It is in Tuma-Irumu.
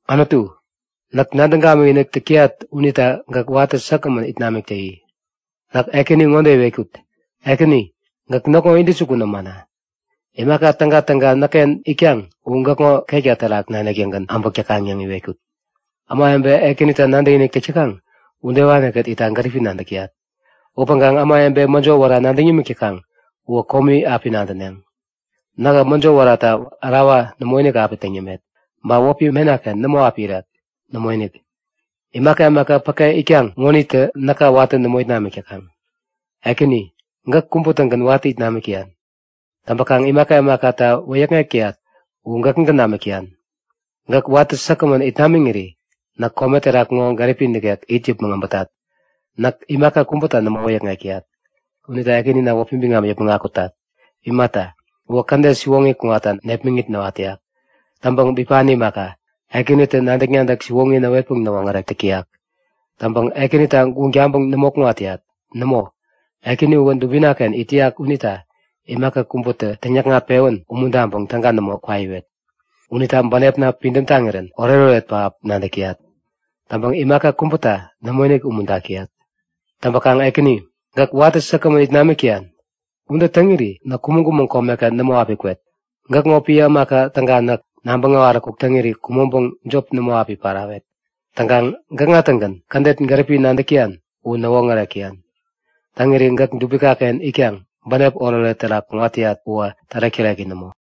Anutu, näk nadäŋ gamikinik täk täyat unita gäk watä säkgämän it namik täyi! Näk Ekäni ŋode iwetkut; Ekäni, gäk näkŋo intäjukun ämana. Imaka tägatäga näkken itkaŋ u gäkŋo ketka terak nanik-tägän äbäk täkaŋ yäŋ iwetkut. Ämawebe Ekänita nadäkinik täk täkaŋ udewanikät itta gäripi nadäk täyat. Upäŋkaŋ ämawebe mäjo wära nadäŋ yämik täkaŋ uwä komi api nadäneŋ. Nähä mäjo wärata ärawa nämoinik api täŋ yämet. Ba wäpi menaken nämo api irek. Nämoinik! Imaka imaka päke itkaŋ ŋonitä näka watä nämo it namik täkaŋ. Ekäni, gäk kubä-tägän watä it namik täyan. Täŋpäkaŋ imaka imakata wäyäkŋek täyat uwä gäkägän namik täyan. Gäk watä säkgämän it namiŋiri näk kome terak ŋo gäripi nikek it yäpmäŋ äbätat. Näk imaka kubäta nämo wäyäkŋek täyat. Unita Ekänina wäpi biŋam yäpmäŋ akutat. Imata, uwä kädet siwoŋi kuŋatta nepmäŋit näwat täyak. Täŋpäŋ bipani imaka, Ekänitä nadäk-nadäk siwoŋi näwetpäŋ näwoŋärek täk täyak. Täŋpäkaŋ Ekänita guŋ taŋpäŋ nämo kuŋat täyat. Nämo, Ekäni uwä dubinaken it täyak unita imaka kubätä täŋyäkŋat-pewän umuntaŋpäŋ täga nämo kwaiwet. Unita bänepna pidäm taŋirän oretoret pähap nadäk täyat. Täŋkaŋ imaka kubäta nämoinik umuntak täyat. Täŋpäkaŋ Ekäni, gäk watä säkgämän it namik täyan. Ude täŋiri näk kumäŋ-kumäŋ komeken nämo api kwet. Gäkŋo piä ämaka täga näk, nabäŋ äwaräkuk täŋiri kumäŋpäŋ jop nämo api parawet. Täŋkaŋ gäkŋa-tägän kädet gäripi nadäk täyan u näwoŋärek täyan. Täŋiri gäk dubikaken itkaŋ bänep oretoret terak kuŋat täyat uwä tärek-täreki nämo!